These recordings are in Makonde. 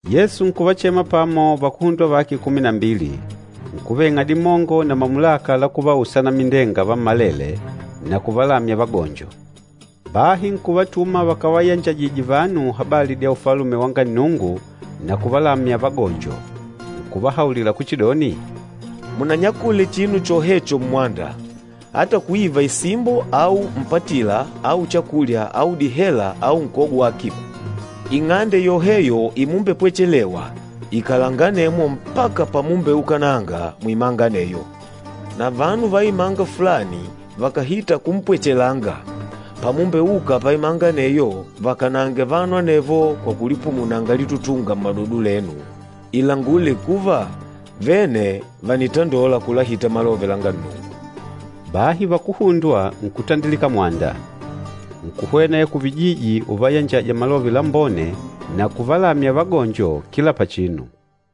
Yesu nkuvachema pamo vakuhundwa vake kumi na mbili, nkuveng'a dimongo na mamulaka la kuvausa anamindenga vammalele na kuvalamya vagonjo. Bahi nkuvatuma vakavayanjajije vanu habali dya Ufalume wanga Nnungu na kuvalamya vagonjo. Nkuvahaulila kuchidoni, “Munanyakule chinu chohecho mmwanda, ata kuiva isimbo au mpatila au chakulya au dihela au nkogo wa akiba. Ing'ande yoheyo imumbepwechelewa, ikalanga anemwo mpaka pamumbeukananga muimanga aneyo. Na vanu va imanga fulani vakàhita kumpwechelanga, pamumbeuka paimanga aneyo vakanange vanu anevo kwa kulipumunanga litutunga mmadodo lenu ilangule kuva vene vànitandola kulahita malove langa Nnungu.” Bahi vakuhundwa nkutandilika mwanda, nkuhwena ya kuvijiji uvayanjaja Malove Lambone na kuvalamya vagonjo kila pachinu.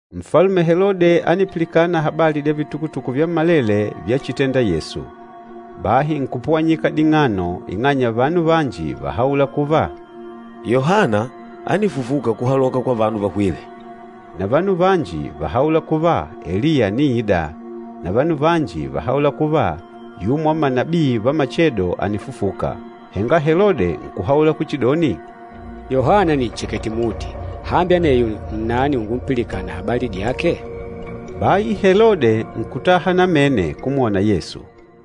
Nfalume Helode ánipilikana habali dya vitukutuku vyammalele vyachitenda Yesu. Bahi nkupuwanyika ding'ano ing'anya vanu vanji váhaula kuva, “Yohana ánifufuka kuhaloka kwa vanu vahwîle!” Na vanu vanji váhaula kuva, Eliya àniida, na vanu vanji váhaula kuva, yumo wa manabii va machedo ànifufuka. Henga Helode nkuhaula kuchidoni, “Yohana nìnchekete muti, hambi aneyo nnani ungumpilikana habali dyake?” Bahi Helode nkutaha namene kumwona Yesu.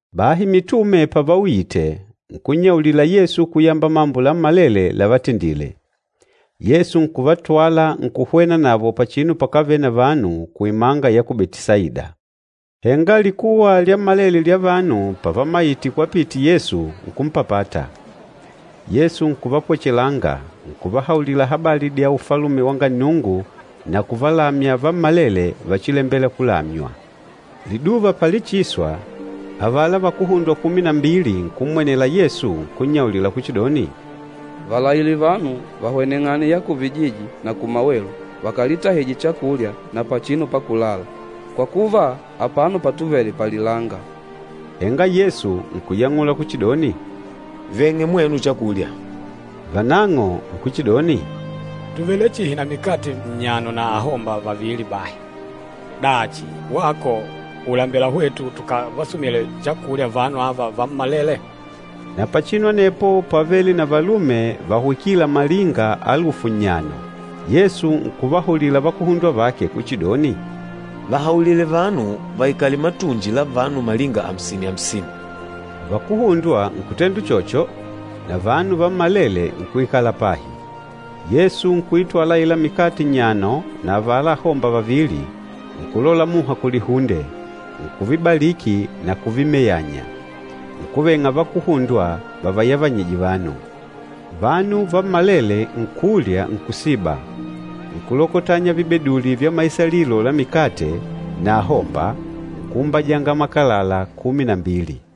Bahi mitume pavauyite, nkunnyaulila Yesu kuyamba mambo lammalele lavatendile. Yesu nkuvatwala nkuhwena navo pachinu pakávele na vanu kuimanga ya ku Betisaida. Henga likuwa lyammalele lya vanu pavamayite kwapite Yesu, nkumpapata. Yesu nkuvapwechelanga, nkuvahaulila habali dya Ufalume wanga Nnungu na nkuvalamya vammalele vachilembela kulamywa. Liduva palichiswa, avala vakuhundwa kumi na mbili nkummwenela Yesu nkunnyaulila kuchidoni, “Valaile vanu vahweneng'ane ya kuvijiji na kumawelu vakalitahije chakulya na pachinu pakulala, kwa kuva, apano patuvele palilanga.” Henga Yesu nkuyang'ula kuchidoni, “Veng'e mwenu chakulya.” Vanang'o nkuchidoni, “Tùvele chihi na mikate nnyano na ahomba vavili bahi. Dachi, wako ùlembela hwetu tukavasumile chakulya vanu ava vammalele?” Na pachinu anepo pávele na valume vahwikîla malinga alufu nnyano. Yesu nkuvahaulila vakuhundwa vake kuchidoni, “Vahaulile vanu vaikale matunji la vanu malinga amsini-amsini.” Vakuhundwa nkutenda uchocho, na vanu vammalele nkuikala pahi. Yesu nkuitwala aila mikate nnyano na avala ahomba vavili, nkulola muha kulihunde, nkuvibaliki na kuvimeyanya, nkuveng'a vakuhundwa vavayavanyije vanu. Vanu vammalele nkulya nkusiba, nkulokotanya vibeduli vya maisalilo la mikate na ahomba nkuumbajanga makalala kumi na mbili.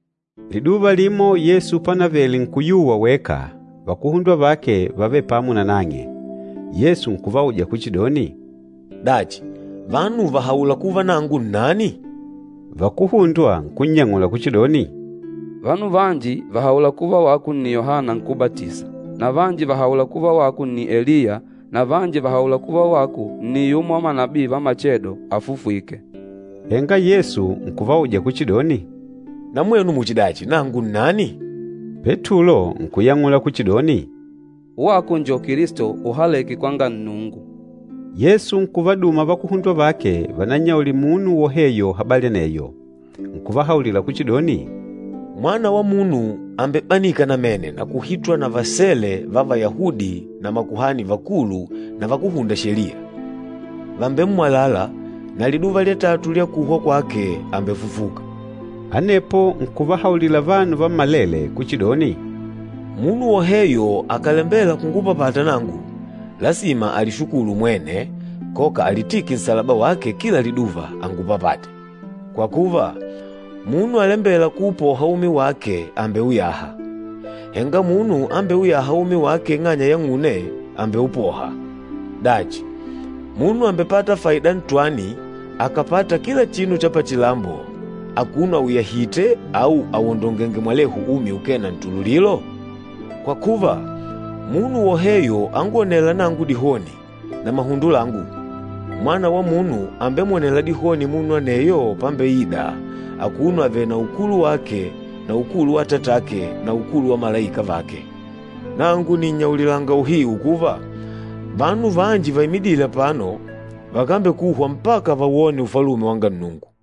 Liduva limo Yesu pánavele nkuyuwa weka, vakuhundwa vake vávele pamo nanang'e. Yesu nkuvauja kuchidoni, “Dachi, vanu vàhaula kuva nangu nnani?” Vakuhundwa nkunnyang'ula kuchidoni, “Vanu vanji vàhaula kuva wako nni Yohana Nkúbatisa, na vanji vàhaula kuva wako nni Eliya na vanji vàhaula kuva wako nni yumo wa manabii va machedo afufwîke.” Henga Yesu nkuvauja kuchidoni, “Na mwenu muchidachi, nangu nnani?” Petulo nkuyang'ula kuchidoni, “Wako njo Kilisto uhalêke kwanga Nnungu.” Yesu nkuvaduma vakuhundwa vake vanannyaulile munu woheyo habali aneyo. Nkuvahaulila kuchidoni, “Mwana wa Munu àmbebanika namene na kuhitwa na vasele va Vayahudi na makuhani vakulu na vakúhunda Sheliya. Vàmbemmwalala, na liduva lya tatu lya kuhwa kwake àmbefufuka.” Anepo nkuvahaulila vanu vammalele kuchidoni, “Munu woheyo akàlembela kungupapata nangu, lasima alishukulu mwene, koka alitike nsalaba wake kila liduva, angupapate. Kwa kuva, munu alembêla kuupoha umi wake àmbeuyaha, henga munu ambeuyâha umi wake ing'anya yang'une, àmbeupoha. Dachi, munu àmbepata faida ntwani akàpata kila chinu cha pachilambo akuno auyahìtè au awondongèngè mwalehu umi ukee na ntululilo? Kwa kuva, munu woheyo angwonêla nangu dihoni na mahundo langu, Mwana wa Munu àmbemwonela dihoni munu aneyo pambeida, akuno avèlè na ukulu wake na ukulu wa Atatake na ukulu wa malaika vake. Nangu nìnnyaulilanga uhiu kuva, vanu vanji vaimidîle apano vakambekuhwa mpaka vawone Ufalume wanga Nnungu.”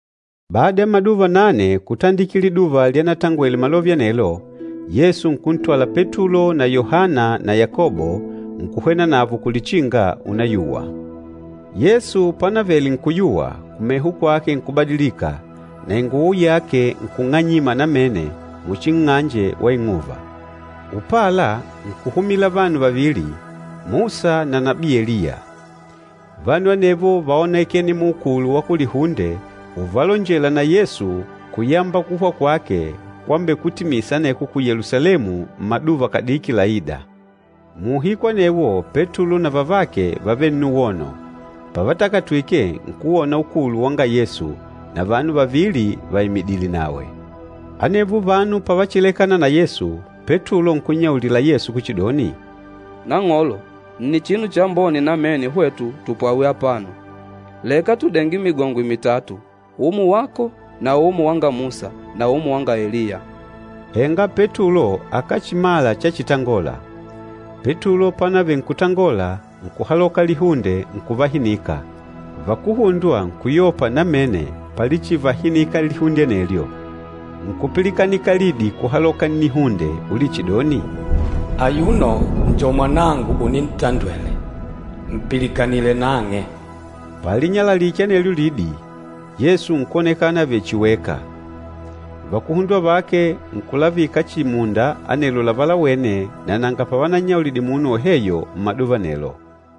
Bada ya maduva nane kutandikila liduva lyanatangwele malove anelo, Yesu nkuntwala Petulo na Yohana na Yakobo, nkuhwena navo kulichinga unayuwa. Yesu pánavele nkuyuwa, kumeho kwake nkubadilika, na inguwo yake nkung'anyima namene muchi nng'anje wa ing'uva. Upala, nkuhumila vanu vavili, Musa na nabii Eliya. Vanu anevo váonekene muukulu wa kulihunde uvalonjela na Yesu kuyamba kuhwa kwake kwambekutimisa aneko ku Yelusalemu mmaduva kadiki laîda. Muuhiku anewo Petulo na vavake vávele nnuwono, pavatakatwike, nkuwona ukulu wanga Yesu, na vanu vavili vaimidìlè nawe. Anevo vanu pavachilekana na Yesu, Petulo nkunnyaulila Yesu kuchidoni, “Nang'olo, nni chinu chambone namene hwetu tupwawe apano. Leka tudenge migongwe mitatu, umo wako na umo wanga Musa na umo wanga Eliya.” Henga Petulo akáchimala chachitangola. Petulo pánavele nkutangola, nkuhaloka lihunde nkuvahinika. Vakuhundwa nkuyopa namene palichivahinika lihunde anelyo. Nkupilikanika lidi kuhaloka kulihunde ulichidoni, “Ayuno njo Mwanangu unintandwele. Mpilikanile nang'e.” Palinyalalike anelyo lidi, Yesu nkwonekana avèlè chihi weka. Vakuhundwa vake nkulavika chihi munda anelo lavalawene na nanga pavanannyaulidile munu woheyo mmaduva anelo.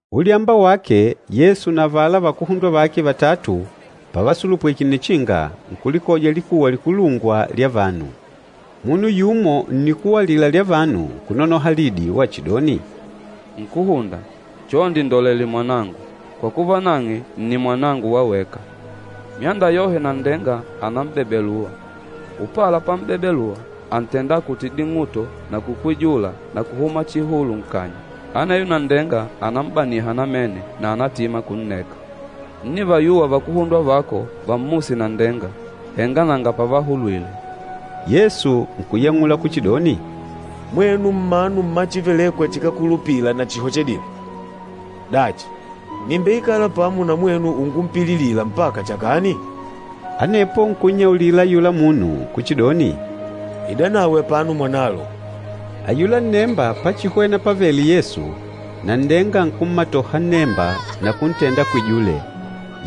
Ulyamba wake, Yesu na avala vakuhundwa vake vatatu pavasulupwike nnichinga, nkulikoja likuwa likulungwa lya vanu. Munu yumo nnikuwa alila lya vanu nkunonoha lidi wachidoni, “Nkúhunda, chonde ndolele mwanangu, kwa kuva nang'e nni mwanangu wa weka! Myanda yohe nanndenga ànam'bebelua. Upala pam'bebelua, àntenda akute ding'uto na kukwijula na kuhuma chihulu nkanya. Aneyo nanndenga ànam'baniha namene na ànatima kunneka. Ńnivayuwa vakuhundwa vako vammuse nanndenga, henga nanga pavahulwile.” Yesu nkuyang'ula kuchidoni, “Mwenu mmanu mma chívelèkwà chikákulupila na chihochedile! Dachi, nìmbeikala pamo na mwenu ungumpililila mpaka chakani?” Anepo nkunnyaulila ayula munu kuchidoni, “Idanawe apano mwanalo.” Ayula nnemba pachihwena pávèlè Yesu, nanndenga nkummatoha nnemba na kuntenda akwijule.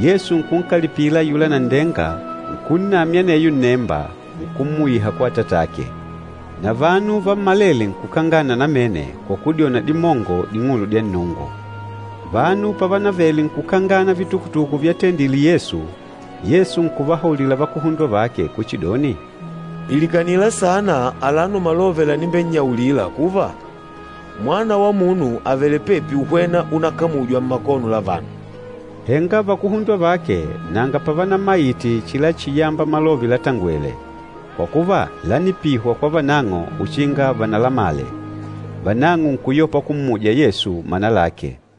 Yesu nkunkalipila ayula nanndenga, nkunnamya aneyo nnemba, nkummuyiha kwa atatake. Na vanu vammalele nkukangana namene kwa kudyona dimongo ding'ulu dya Nnungu. Vanu pavanavele nkukangana vitukutuku vyatendile Yesu, Yesu nkuvahaulila vakuhundwa vake kuchidoni, “Pilikanila sana alano malove lanimbennyaulila kuva, Mwana wa Munu àvele pepi uhwena unakamujwa mmakono la vanu.” Henga vakuhundwa vake nanga pavanamayite chilachiyamba malove latangwele, kwa kuva lánipihwa kwa vanang'o uchinga vanalamale. Vanang'o nkuyopa kummuja Yesu mana lake.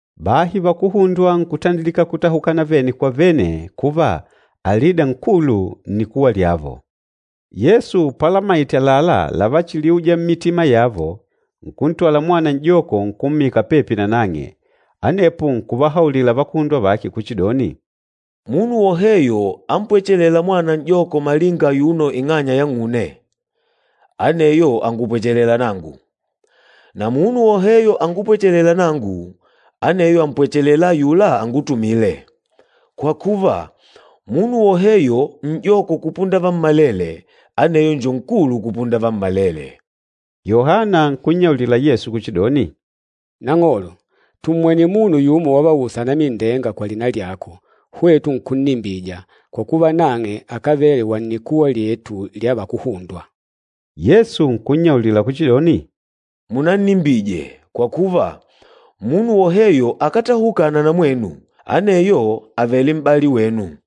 Bahi vakuhundwa nkutandilika kutahukana vene kwa vene kuva, alida nkulu nnikuwa lyavo. Yesu palamaite àlalá lavachiliuja mmitima yavo, nkuntwala mwana n'joko nkummika pepi nanang'e. Anepo nkuvahaulila vakuhundwa vake kuchidoni, “Munu woheyo ampwechelêla mwana n'joko malinga ayuno ing'anya yang'une, aneyo àngupwechelela nangu, na munu woheyo angupwechelêla nangu, aneyo àmpwechelela ayula angutumîle. Kwa kuva, munu woheyo n'joko kupunda vammalele, aneyo njo nkulu kupunda vammalele.” Yohana nkunnyaulila Yesu kuchidoni, “Nang'olo, tummwene munu yumo wavausa anamindenga kwa lina lyako, hwetu nkunnimbija, kwa kuva nang'e akávele wa nnikuwa lyetu lya vakuhundwa.” Yesu nkunnyaulila kuchidoni, “Munannimbije, kwa kuva, munu woheyo akátahukana na mwenu, aneyo àvele m'bali wenu.”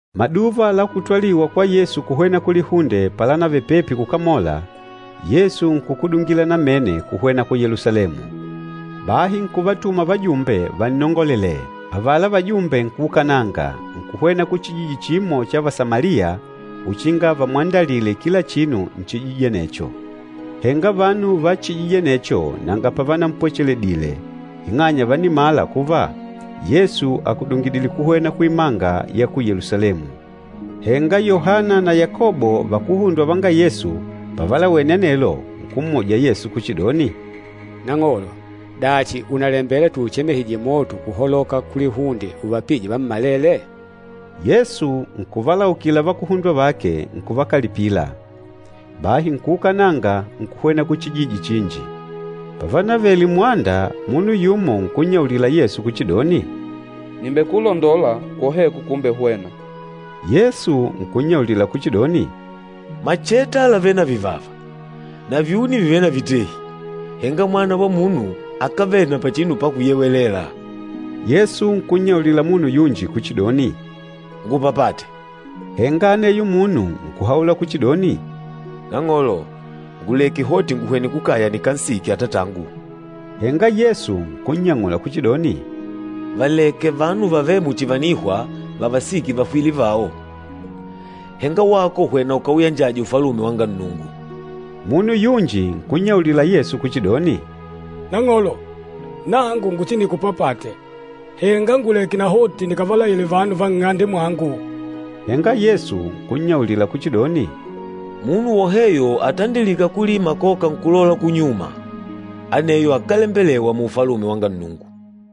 Maduva la kutwaliwa kwa Yesu kuhwena kulihunde palanavele pepi kukamola, Yesu nkukudungila namene kuhwena ku Yelusalemu. Bahi nkuvatuma vajumbe vannongolelee. Avala vajumbe nkuukananga, nkuhwena kuchijiji chimo cha Vasamaliya uchinga vamwandalile kila chinu nchijiji anecho. Henga vanu va chijiji anecho nanga pavanampwacheledile ing'anya vánimala kuva Yesu àkudungidile kuhwena kuimanga ya ku Yelusalemu. Henga Yohana na Yakobo vakuhundwa vanga Yesu, pavalawene anelo, nkummuja Yesu kuchidoni, “Nang'olo, dachi ùnalembela tuuchemehije moto kuhaloka kulihunde uvapije vammalele?” Yesu nkuvalaukila vakuhundwa vake, nkuvakalipila. Bahi nkuukananga nkuhwena kuchijiji chinji. Pavanavele mmwanda, munu yumo nkunnyaulila Yesu kuchidoni, “Nìmbekulondola kwoheko kumbehwena.” Yesu nkunnyaulila kuchidoni, “Macheta làvele na vivava, na vyuni vìvele na vitehi, henga Mwana wa Munu akávele na pachinu pakuyewelela.” Yesu nkunnyaulila munu yunji kuchidoni, “Ngupapate.” Henga aneyo munu nkuhaula kuchidoni, “Nang'olo, nguleke hoti nguhwene kukaya nikansike atatangu.” Henga Yesu nkunnyang'ula kuchidoni, “Valeke vanu vavêle muchi vànihwa vavasike vahwîle vao, henga wako hwena ukauyanjaje Ufalume wanga Nnungu.” Munu yunji nkunnyaulila Yesu kuchidoni, “Nang'olo, nangu nguchinikupapate, henga nguleke nahoti nikavalaile vanu va nng'ande mwangu.” Henga Yesu nkunnyaulila kuchidoni, “Munu woheyo atandilîka kulima koka nkulola kunyuma, aneyo akálembelewa mu Ufalume wa Nnungu.”